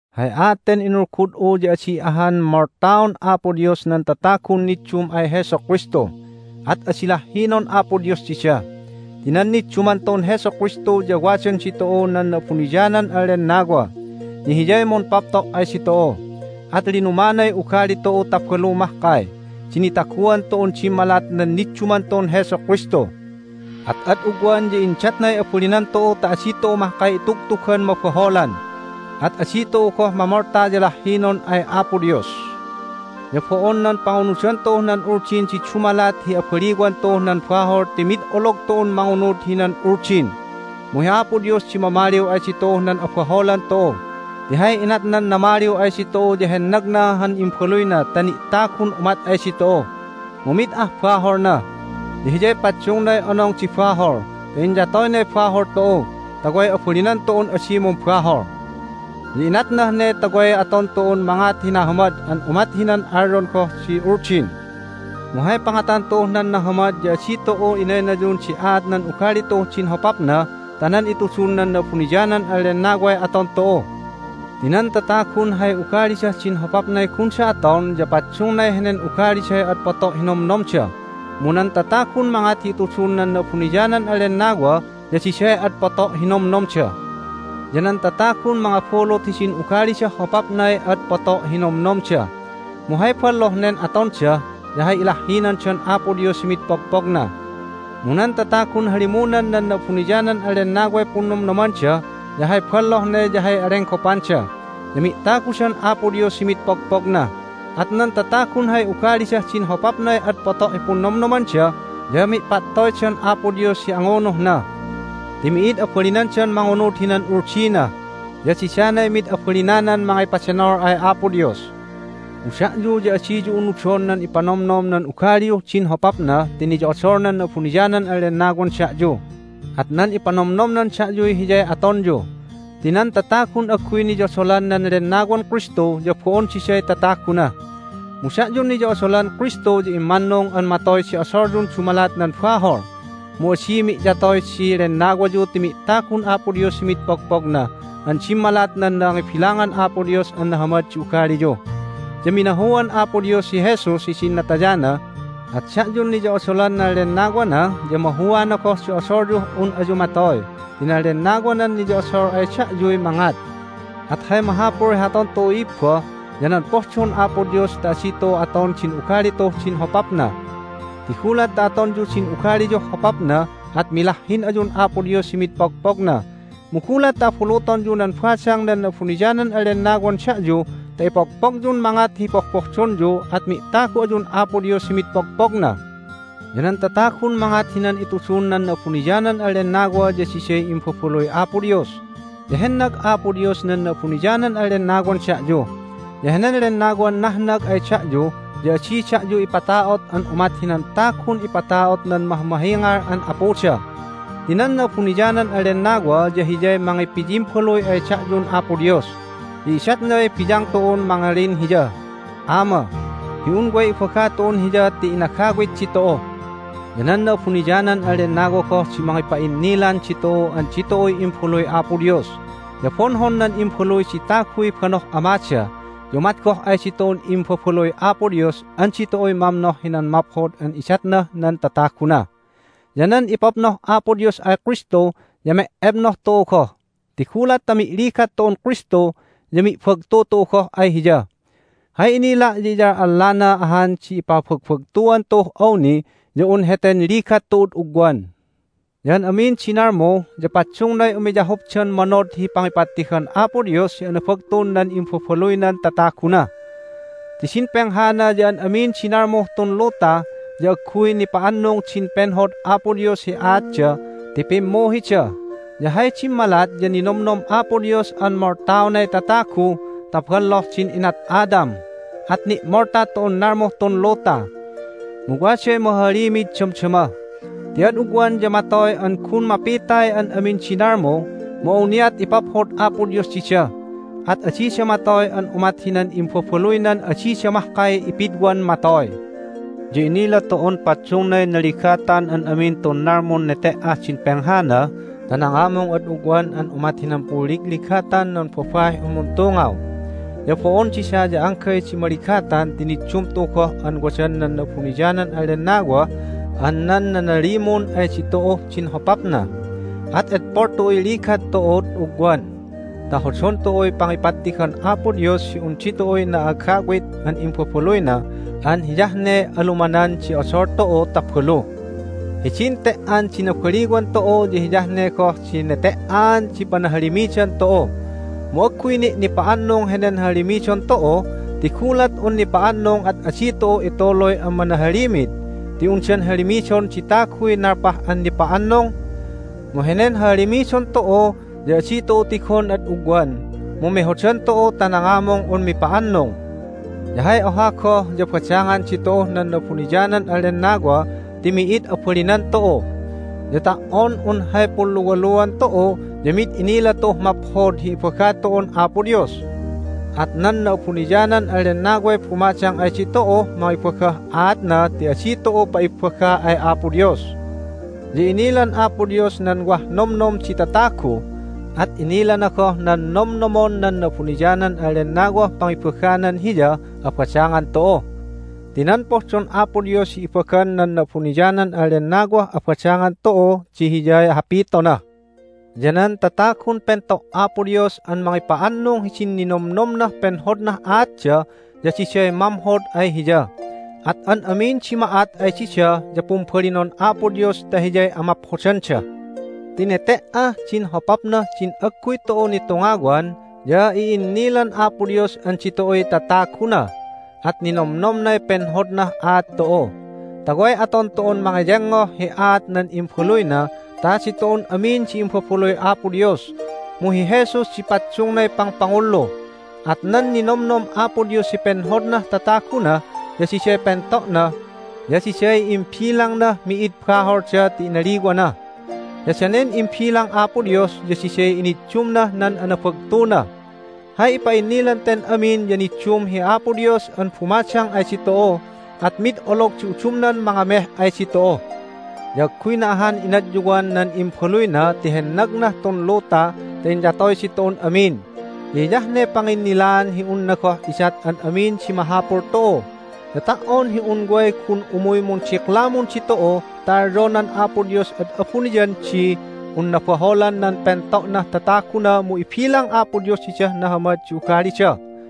Hay aat ten inulgud'u ya adi ahan moltaon Apo Dios nan tatagun niddum ay Jesu Kristu, at adi lahhinon Apo Dios dida. Ti nan nidduman tu'un Jesu Kristu ya wadan ditu'u nan Na'abuniyanan an Lennawa, ya Hiyay mumpapto' ay ditu'u. At linumanay ugali tu'u ta balu mahkay di nitaguan tu'un dimmalat nan nidduman tu'un Jesu Kristu. At ad ugwan ya indatnay abalinan tu'u ta adi tu'u mahkay itugtugan mabaholan, at adi tu'u goh mamolta ya lahhinon ay Apo Dios. Ya bo'on nan pangunudan tu'uh nan Uldin di dumalat hi abaliwan tu'uh nan bahol ti mid olog tu'un mangunud hinan Uldin. Mu hi Apo Dios di mamaliw ay ditu'uh nan abaholan tu'u, ti hay inatnan namaliw ay ditu'u ya hennagna han Imbaluyna ta ni'tagun umat ay ditu'u. Mu mid ah baholna, ya Hiyay paddungnay Onong di Bahol ta inyatoynay bahol tu'u ta way abalinan tu'un adi mumbahol. Ya inatnah ne ta way aton tu'un mangat hi nahamad an umat hinan alyon goh di Uldin. Mu hay pangatan tu'uh nan nahamad ya adi tu'u inaynayun di aat nan ugali tu'uh din hopapna ta nan itudun nan Na'abuniyanan an Lennaway aton tu'u. Ti nan tatagun hay ugalidah din hopapnay gunda aton ya paddungnay henen ugaliday ad poto' hi nomnomda. Mu nan tatagun mangat hi itudun nan Na'abuniyanan an Lennawa ya diday ad poto' hi nomnomda. Ya nan tatagun mangabulut hidin ugalidah hopapnay ad poto' hi nomnomda, mu hay balloh nen atonda ya hay ilahhinandan Apo Dios hi mid pogpogna. Mu nan tatagun halimunan nan Na'abuniyanan an Lennaway punnomnomanda ya hay balloh ne ya hay alenggopanda, ya mi'tagudan Apo Dios hi mid pogpogna. At nan tatagun hay ugalidah din hopapnay ad poto' hi punnomnomanda ya mi'pattoydan Apo Dios hi angunuhna. Ti mi'id abalinandan mangunud hinan Uldina, ya didanay mid abalinanan mangipadenol ay Apo Dios. Mu da'yu ya adiyu unudon nan ipanomnom nan ugaliyuh din hopapna ti niyo'odol nan Na'abuniyanan an Lennawan da'yu, at nan ipanomnomnan da'yuy hiyay atonyu. Ti nan tatagun agguy niyodolan nan Lennawan Kristu ya bo'on diday tataguna. Mu da'yun niyo'odolan Kristu ya immannung an matoy di odolyun dumalat nan bahol. Mu adi mi'yatoy di lennawayu ti mi'tagun Apo Dios hi mid pogpogna an dimmalat nan nangibilangan Apo Dios an nahamad di ugaliyu. Ya minahuan Apo Dios hi Jesus hidin natayana, at da'yun niyo'odolan nan Lennawana ya mahuana goh di odolyuh un ayu matoy ti nan Lennawanan niyo'odol ay da'yuy mangat. At hay mahapul hi aton tu'u, i'ibba, ya nan pohdon Apo Dios ta adi tu'u aton din ugali tu'uh din hopapna. Ti gulat ta atonyu din ugaliyuh hopapna at milahhin ayun Apo Dios hi mid pogpogna. Mu gulat ta abulutonyu nan badang nan Na'abuniyanan an Lennawan da'yu ta ipogpogyun mangat hi pohpohdonyu at mi'tagu ayun Apo Dios hi mid pogpogna. Ya nan tatagun mangat hinan itudun nan Na'abuniyanan an Lennawa ya diday imbabaluy Apo Dios. Ya hennag Apo Dios nan Na'abuniyanan an Lennawan da'yu, ya henen Lennawan nahnag ay da'yu ya adi da'yu ipata'ot an umat hinan tagun ipata'ot nan mahmahingal an apuda. Ti nan Na'abuniyanan an Lennawa ya Hiyay mangipiyimbaluy ay da'yun Apo Dios, ya idatnay biyang tu'un mangalin Hiyah, "Ama!" hi un way ibaga tu'un Hiya ti inagawit ditu'u. Ya nan Na'abuniyanan an Lennawa goh di mangipa'innilan ditu'u an ditu'uy imbaluy Apo Dios. Ya bonhon nan imbaluy di taguy banoh amada, ya umat goh ay ditu'un imbabaluy Apo Dios an ditu'uy mamnoh hinan maphod an idatnah nan tataguna. Ya nan ipabnoh Apo Dios ay Kristu ya me'ebnoh tu'u goh, ti gulat ta mi'ligat tu'un Kristu ya mi'bagtu tu'u goh ay Hiya. Hay inila' ya iyal'allana ahan di ipabagbagtuan tu'uh awni ya un heten ligat tu'ud ugwan. Ya an amin di nalmu ya paddungnay umiyahupdan manod hi pangipattigan Apo Dios hi anabagtun nan imbabaluynan tataguna. Ti din penghana ya an amin di nalmuh tun luta ya agguy nipa'annung din penhod Apo Dios hi aatda ti pimmuhida. Ya hay dimmalat ya ninomnom Apo Dios an moltaonay tatagu ta balloh din inat Adam, at ni'molta tun nalmuh tun luta. Mu waday mahahalimid damdama ti ad ugwan ya matoy an gun mapitay an amin di nalmu. Mu awniat ipaphod Apo Dios dida, at adida matoy an umat hinan imbabaluynan adida mahkay ipidwan matoy. Ya inila tu'un paddungnay naligatan an amin tun nalmun nete"ah din penghana ta nangamung ad ugwan an umat hinan punligligatan nan babaih un muntungaw. Ya bo'on dida ya anggay di maligatan ti niddum tu'u goh an wadan nan Na'abuniyanan an Lennawa an nan nanalimun ay ditu'uh din hopapna. At edpol tu'uy ligat tu'ud ugwan ta hodon tu'uy pangipattigan Apo Dios hi un ditu'uy na'agawit an imbabaluyna an hiyah ne alumanan di odol tu'u ta balu. Hidin te"an di nabaliwan tu'u ya hiyah ne goh di nete"aan di panahalimidan tu'u. Mu agguy ni' nipa'annung henen hahalimidon tu'u, ti gulat un nipa'annung at adi tu'u ituluy an manahalimid, ti undan halimidon di taguy nalpah an nipa'annung? Mu henen hahalimidon tu'u ya adi tu'u tigon ad ugwan, mu mehodan tu'u ta nangamung un mipa'annung. Ya hay oha goh ya badangan ditu'uh nan Na'abuniyanan an Lennawa ti mi'id abalinan tu'u. Ya ta"on un hay punluwaluan tu'u ya mid inila tu'uh maphod hi ibaga tu'un Apo Dios. At nan Na'abuniyanan an Lennaway bumadang ay ditu'uh mangibagah aatna ti adi tu'u pa'ibagga ay Apo Dios. Ya inilan Apo Dios nan wah nomnom di tatagu, at inilana goh nan nomnomon nan Na'abuniyanan an Lennawah pangibaganan Hiyah abadangan tu'u. Ti nan pohdon Apo Dios hi ibagan nan Na'abuniyanan an Lennawah abadangan tu'u di hiyay hapitona. Ya nan tatagun pento' Apo Dios an mangipa'annung hidin ninomnomnah penhodnah aatda ya diday mamhod ay Hiya, at an amin di ma'at ay dida ya pumbalinon Apo Dios ta hiyay amaphodanda. Ti nete"ah din hopapnah din agguy tu'u nitungawan ya i'innilan Apo Dios an ditu'uy tataguna, at ninomnomnay penhodnah aat tu'u, ta way aton tu'un mangeyengngoh hi aat nan Imbaluyna ta ditu'un amin di imbabaluy Apo Dios. Mu hi Jesus di paddungnay pangpangullu. At nan ninomnom Apo Dios hi penhodnah tataguna ya diday pento'na, ya diday imbilangnah mi'id baholda ti inaliwana, ya danen imbilang Apo Dios ya diday iniddumnah nan anabagtuna. Hay ipa'innilan ten amin ya niddum hi Apo Dios an bumadang ay ditu'u, at mid olog di udumnan mangameh ay ditu'u! Ya agguyna ahan inadyuwan nan Imbaluyna ti hennagnah tun luta ta inyatoy ditu'un amin! Ya hiyah ne panginnilaan hi unna goh idat an amin di mahapul tu'u! Ya ta"on hi un way gun umuy mundiklamun ditu'u ta alyonan Apo Dios ad abuniyan di un nabaholan nan pento'nah tataguna mu ibilang Apo Dios didah nahamad di ugalida!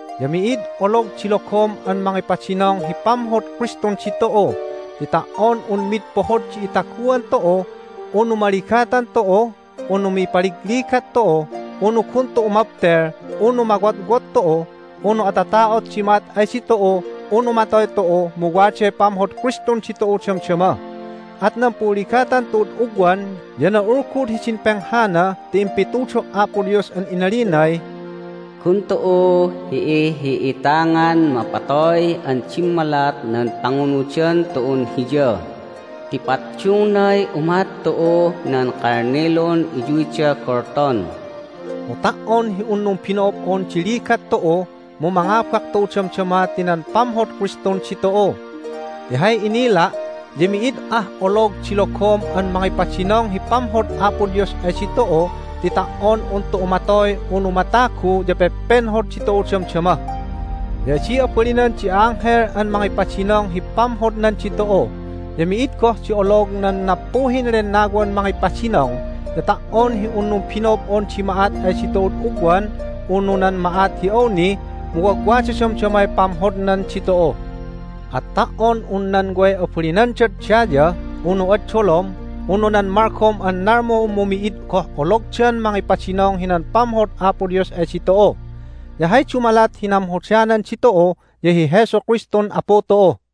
Ya mi'id olog di logom an mangipadinong hi pamhod Kristun ditu'u! Ti ta"on un mid pohod di itaguan tu'u, unu maligatan tu'u, unu mipaligligat tu'u, unu gun tu'u mabtel, unu mawotwot tu'u, unu atata'ot di ma'at ay ditu'u, unu matoy tu'u mu waday pamhod Kristun ditu'u damdama. At nan punligatan tu'ud ugwan ya na'ulgud hidin penghana ti impitudo' Apo Dios an inalinay, "Gun tu'u hi'ihi'itangan mapatoy an dimmalat nan pangunudan tu'un Hiya ti paddungnay umat tu'uh nan kalnilun iyuyda golton." Mu ta"on hi un numbino'ob'on di ligat tu'u mu mangabak tu'u damdama ti nan pamhod Kristun ditu'u! Ti hay inila' ya mi'id ah olog di logom an mangipadinong hi pamhod Apo Dios ay ditu'u ti ta"on un tu'u matoy unu matagu ya pepenhod ditu'u damdama. Ya adi abalinan di a'anghel an mangipadinong hi pamhodnan ditu'u, ya mi'id goh di olog nan nappuhin lennawan mangipadinong, ya ta"on hi un numbino'ob'on di ma'at ay ditu'ud ugwan, unu nan ma'at hi awni, mu wagwada damdamay pamhodnan ditu'u. At ta"on un nan way abalinandad daya, unu ad dolom, unu nan malgom an nalmu mu mid goh ologdan mangipadinong hinan pamhod Apo Dios ay ditu'u. Ya hay dumalat hi namhodanan ditu'u ya hi Jesu Kristun Apu tu'u.